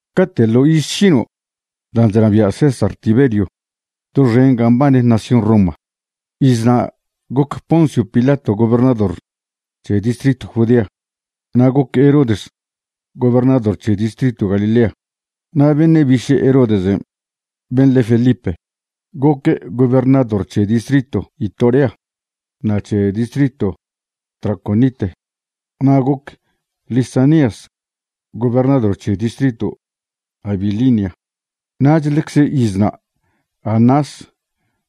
Cate' ḻo iz šino' dan' chnabia' César Tiberio doxen ga mbane nación Roma, izna' goc Poncio Pilato gobernador c̱he distritw Judea, na' goc Herodes gobernador c̱he distritw Galilea. Na' beṉe' biše' Herodesen', ben' le Felipe, goque' gobernador c̱he distritw Itorea na' c̱he distritw Traconite. Na' goc Lisanias gobernador c̱he distritw Abilinia. Nach ḻecze izna' Anás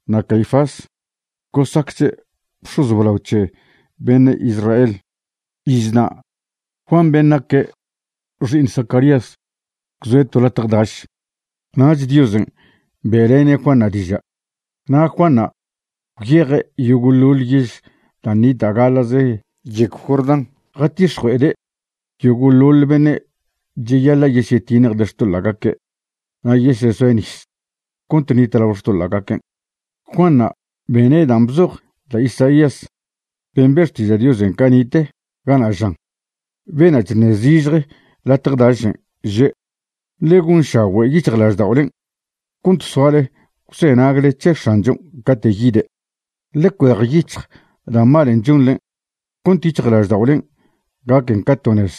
na' Caifás gosacche' bx̱oz blao c̱he beṉe' Israel. Izna' Juan ben' naque' xi'iṉ Zacarías gwzoe' to latje daš. Nach Diosen' be'lene' Juanṉa' diža'. Na' Juanṉa' gwyeje' yogo'ḻoḻ yež dan' nita' gaḻa'ze yegw Jordán, jatix̱jue'ede' yogo'ḻoḻ beṉe' cheyaḻa' yesyetiṉjde' xtoḻa'gaque' na' yesezoe' nis cont ṉitlao xtoḻa'gaquen'. Juanṉa' bene' dan' bzoj da' Isaías ben' be' xtiža' Diosen' cani'te, gana' žan: Bena' chṉe' zižje latje dašen', že': “Ḻe gonšagüe' yic̱hjlažda'olen' cont soale gwzenagle c̱he X̱anchon' cate' yide', ḻe cuejyic̱hj da' malen' chonḻe cont yic̱hjlažda'olen' gaquen ca to nez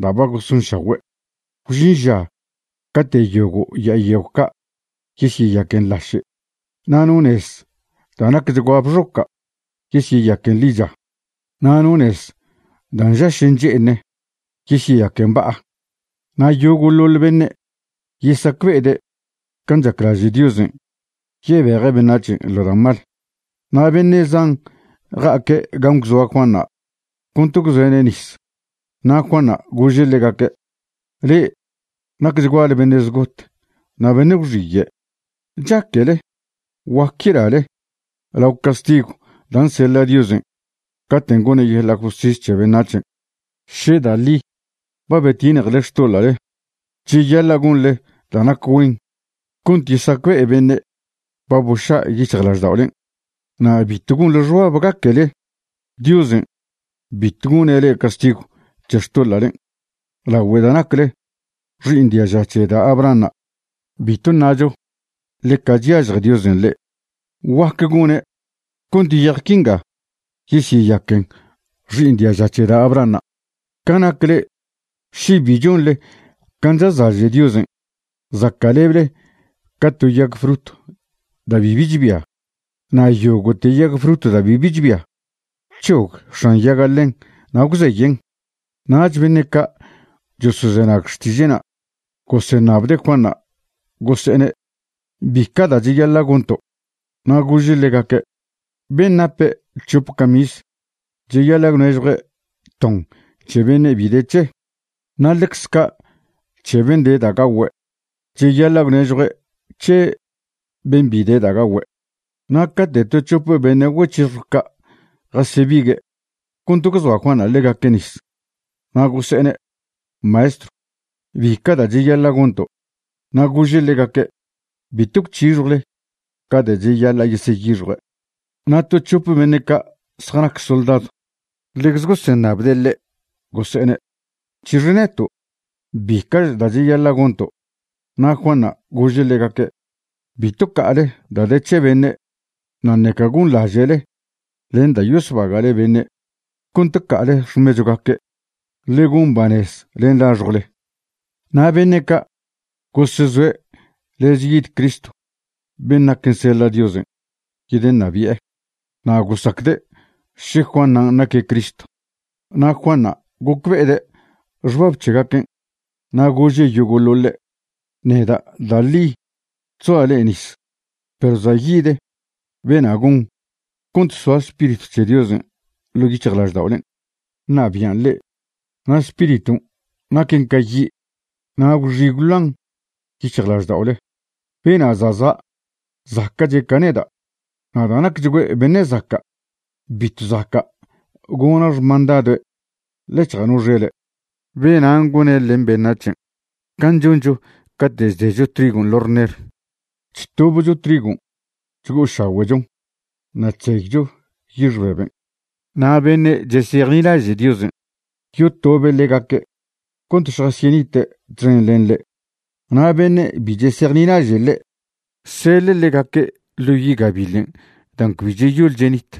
da' ba gosonšagüe'. Gwžin ža cate' yogo' ya'a yegw ca' yesyeyaquen laše', na' no nez da' nacchgua bxoca' yesyeyaquen ḻicha, na' no nez da' nžaš nche'eṉe yesyeyaquen ba'a. Na' yogo'ḻoḻ beṉe' yesacbe'ede' can' chaclaže' Diosen' yebeje' beṉac̱hen' ḻo da' mal.” Na' beṉe' zan ja'aque' gan' gwzoa Juanṉa' cont gwzoe'ne' nis. Na' Juanṉa' gože' ḻegaque': ―Le'e nacchguale beṉe' zgot na' beṉe' gwxiye'. ¿Chaquele guac yelale lao castigw dan' seḻa' Diosen' caten' gone' yeḻa' justis c̱he beṉac̱hen'? Še da' ḻi ba betiṉjele xtoḻa'le, cheyaḻa' gonḻe da' nac güen cont yesacbe'e beṉe' ba boša' yic̱hjlažda'olen'. Na' bitw gonḻe xbab gaquele Diosen' bitw gone' le'e castigw c̱he xtoḻa'len' lagüe da' nacle xi'iṉ diaža c̱he da' Abrahanṉa'. Bitw ṉacho ḻeca chyažje Diosen' le'e. Guac gone' cont yej quinga yesyeyaquen xi'iṉ diaža c̱he da' Abrahanṉa'. Ca nac le'e, še bi chonḻe can' chazlaže' Diosen', zaca'leble ca to yag frut da' bibi chbia. Na' yogo'te yag frut da' bibi chbia, c̱hog x̱an yaga' ḻen na' gwzeyen'. Nach beṉe' ca' chosozenag xtiže'na' goseṉabde' Juanṉa', gose'ene': ―¿Bica' da' cheyaḻa' gonto'? Na' gože' ḻegaque': ―Ben' nape' c̱hope camis cheyaḻa' gwnežjue' ton c̱he beṉe' bi de c̱he'. Na' ḻecze ca' c̱he ben' de da' gagüe', cheyaḻa' gwnežjue' c̱he ben' bi de gagüe'. Na' cate' to c̱hope beṉe' güec̱hixjw ca' jasebigue' cont gwzoa Juanṉa' ḻegaque' nis, na' gose'ene': ―Maestrw, ¿bica' da' cheyaḻa' gonto'? Na' gože' ḻegaque': ―Bitw gwc̱hixjwchle ca da' cheyaḻa' yeseyixjue'. Na' to c̱hope beṉe' ca' zjanac soldadw ḻecze goseṉabde' ḻe', gose'ene': ―¿C̱hix neto'? ¿Bica'ch da' cheyaḻa' gonto'? Na' Juanṉa' gože' ḻegaque': ―Bitw ca'ale da' de c̱he beṉe', na' ṉeca gonḻaže'le len da' yosbague'le beṉe' cont ca'ale xmechwgaque'. Ḻe gon banez len laxjwle. Na' beṉe' ca' gosezoe' lez yid Cristo ben' naquen seḻa' Diosen' yedeṉabi'e, na' gosacde' še Juanṉa' naque' Cristo. Na' Juanṉa' gocbe'ede' xbab c̱hegaquen' na' gože' yogo'ḻoḻe': ―Neda' da' ḻi chzoa' le'e nis, perw za' yid bena' gon cont soa Spiritw c̱he Diosen' ḻo' yic̱hjlažda'olen' ṉabian' le'e. Na' Spiriton' naquen ca yi', na' gwxi gwloan yic̱hjlažda'ole. Bena' za' za' zaca'che' ca neda', na' da' nacchgüe' beṉe zaca' bitw zaca' gona' xmandadoe' ḻec̱hja' no xele'. Benan' gone' len beṉac̱hen' can' choncho cate' chdecho trigon' ḻo' rner. Chtobcho trigon' chgo'ošagüe'chon na' chzeycho yix beben'. Na' beṉe' chesejnilaže' Diosen', yotobe' ḻegaque' cont šjasyenite' txen len ḻe', na' beṉe' bi chesejnilaže' ḻe', seḻe' ḻegaque' ḻo yi' gabiḻen' dan' cbi cheyol chenit.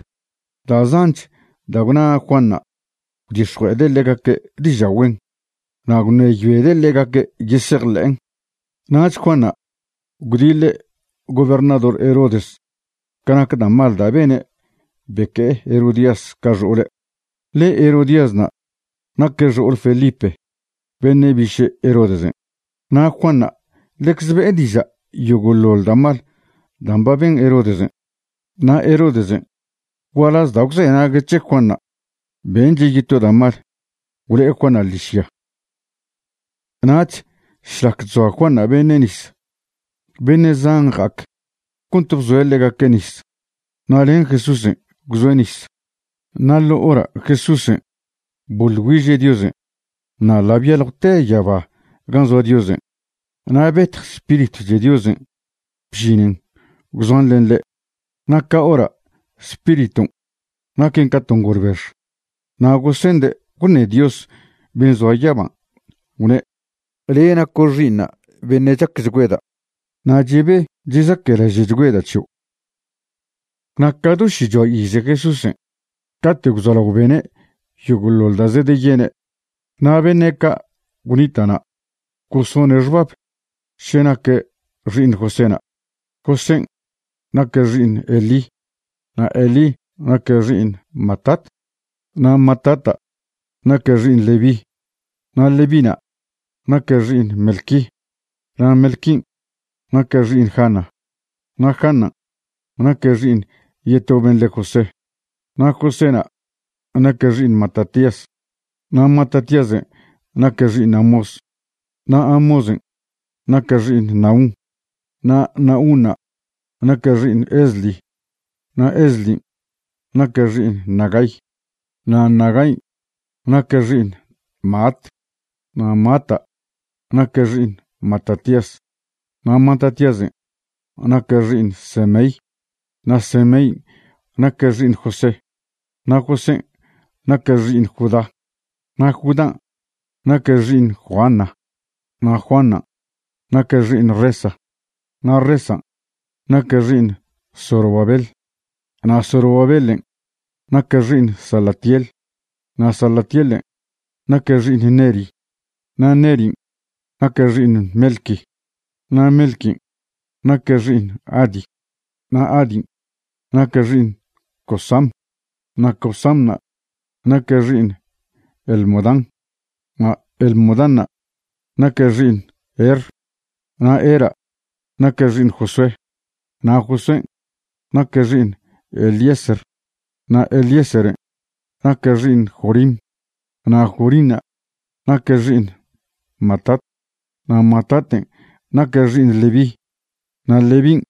Da' zanch da' gwna Juanṉa' gwdix̱jue'ede' ḻegaque' diža' güen, na' gwṉeyoede' ḻegaque' yesejḻe'en. Nach Juanṉa' gwdiḻe' gobernador Herodes ca nac da' mal da' bene' beque'e Herodías ca xo'ole', ḻe Herodíasna' naque' xo'ole Felipe beṉe' biše' Herodesen'. Na' Juanṉa' ḻecze be'e diža' yogo'ḻoḻ da' mal dan' ba ben Herodes. Na' Herodesen', gualaz da' gwzenague' c̱he Juanṉa', benche' yeto da' mal, gwlo'e Juanṉa' ḻižya. Nach šlac chzoa Juanṉa' beṉe' nis, beṉe' zan ja'ac cont bzoe' ḻegaque' nis. Na' len Jesúsen' gwzoe' nis. Na' ḻo hora' Jesúsen' boḻ güiže' Diosen' na' ḻa' byaljwte yaba gan' zoa Diosen'. Na' betj Spiritw c̱he Diosen' bžinen gwzoan len ḻe', na' ca hora' Spiriton' naquen ca to ngolbex. Na' gosende' gwṉe Dios ben' zoa yaban', gwne': ―Le' naco' Xi'iṉa' beṉe' chacchgüeda', na' chebe chezaquelaže'chgüeda' c̱hio'. Na' ca do šichoa ize Jesúsen' cate' gwzolao bene' yogo'ḻoḻ da' zedeyene'. Na' beṉe' ca' gwnita' na' gosone' xbab še naque' xi'iṉ Joséna'. Josén' naque' xi'iṉ Elí, na' Elí naque' xi'iṉ Matat, na' Matata' naque' xi'iṉ Leví, na' Levína' naque' xi'iṉ Melqui, na' Melquin' naque' xi'iṉ Jana, na' Janan' naque' xi'iṉ yeto ben' le' José. Na' Joséna' naque' xi'iṉ Matatías, na' Matatíasen' naque' xi'iṉ Amós, na' Amósen' naque' xi'iṉ Nahum, na' Nahunṉa' naque' xi'iṉ Esli. Na' Eslin' naque' xi'iṉ Nagai, na' Nagain' naque' xi'iṉ Maat, na' Maata' naque' xi'iṉ Matatías, na' Matatíasen' naque' xi'iṉ Semei, na' Semein' naque' xi'iṉ José, na' Josén' naque' xi'iṉ Judá. Na' Judán' naque' xi'iṉ Joana, na' Joanan' naque' xi'iṉ Resa, na' Resan' naque' xi'iṉ Zorobabel, na' Zorobabelen' naque' xi'iṉ Salatiel, na' Salatielen' naque' xi'iṉ Neri, na' Nerin' naque' xi'iṉ Melqui, na' Melquin' naque' xi'iṉ Adi, na' Adin' naque' xi'iṉ Cosam, na' Cosanṉa' naque' xi'iṉ Elmodam, na' Elmodanṉa' naque' xi'iṉ Er. Na' Era' naque' xi'iṉ Josué, na' Josuén' naque' xi'iṉ Eliezer, na' Eliezeren' naque' xi'iṉ Jorim, na' Jorinṉa' naque' xi'iṉ Matat. Na' Mataten' naque' xi'iṉ Leví, na' Levín'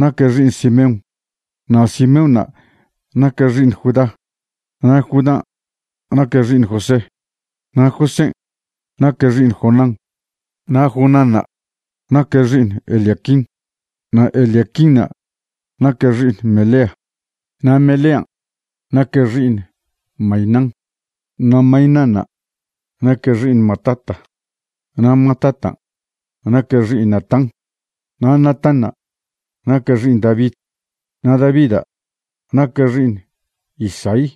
naque' xi'iṉ Simeón, na' Simeóna' naque' xi'iṉ Judá, na' Judán' naque' xi'iṉ José, na' Josén' naque' xi'iṉ Jonán, na' Jonánṉa' naque' xi'iṉ Eliaquim. Na' Eliaquinṉa' naque' xi'iṉ Melea, na' Melean' naque' xi'iṉ Mainán, na' Mainánṉa' naque' xi'iṉ Matata, na' Matatan' naque' xi'iṉ Natán. Na' Natánṉa' naque' xi'iṉ David, na' Davida' naque' xi'iṉ Isaí,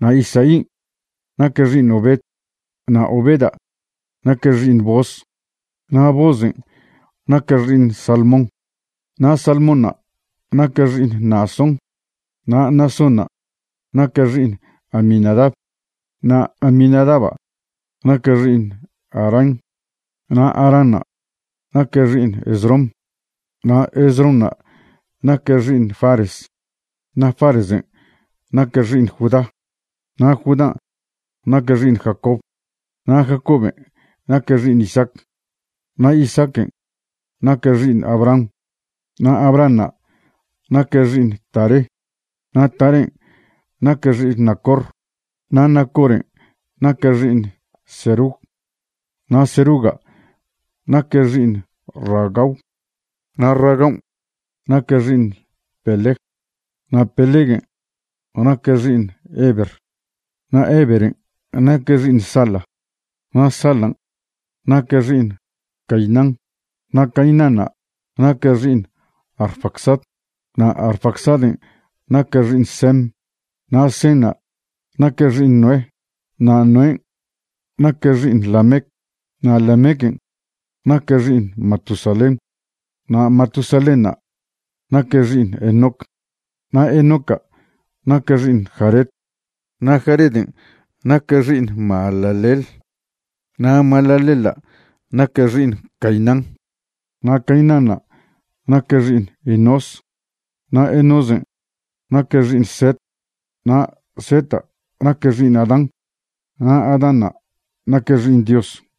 na' Isaín' naque' xi'iṉ Obed, na' Obeda' naque' xi'iṉ Booz, na' Boozen' naque' xi'iṉ Salmón, na' Salmónṉa' naque' xi'iṉ Naasón. Na' Naasónṉa' naque' xi'iṉ Aminadab, na' Aminadaba' naque' xi'iṉ Aram, na' Aranṉa' naque' xi'iṉ Esrom, na' Esronṉa' naque' xi'iṉ Fares. Na' Faresen' naque' xi'iṉ Judá, na' Judán' naque' xi'iṉ Jacob, na' Jacoben' naque' xi'iṉ Isaac, na' Isaaquen' naque' xi'iṉ Abraham, na' Abrahanṉa' naque' xi'iṉ Taré, na' Tarén' naque' xi'iṉ Nacor. Na' Nacoren' naque' xi'iṉ Serug, na' Seruga' naque' xi'iṉ Ragau, na' Ragaun' naque' xi'iṉ Peleg, na' Peleguen' naque' xi'iṉ Heber. Na' Heberen' naque' xi'iṉ Sala, na' Salan' naque' xi'iṉ Cainán, na' Cainánṉa' naque' xi'iṉ Arfaxad, na' Arfaxaden' naque' xi'iṉ Sem, na' Senṉa' naque' xi'iṉ Noé, na' Noén' naque' xi'iṉ Lamec. Na' Lamequen' naque' xi'iṉ Matusalén, na' Matusalénṉa' naque' xi'iṉ Enoc, na' Enoca' naque' xi'iṉ Jared, na' Jareden' naque' xi'iṉ Mahalaleel. Na' Mahalaleela' naque' xi'iṉ Cainán, na' Cainánṉa' naque' xi'iṉ Enós, na' Enósen' naque' xi'iṉ Set, na' Seta' naque' xi'iṉ Adán, na' Adánṉa' naque' xi'iṉ Dios.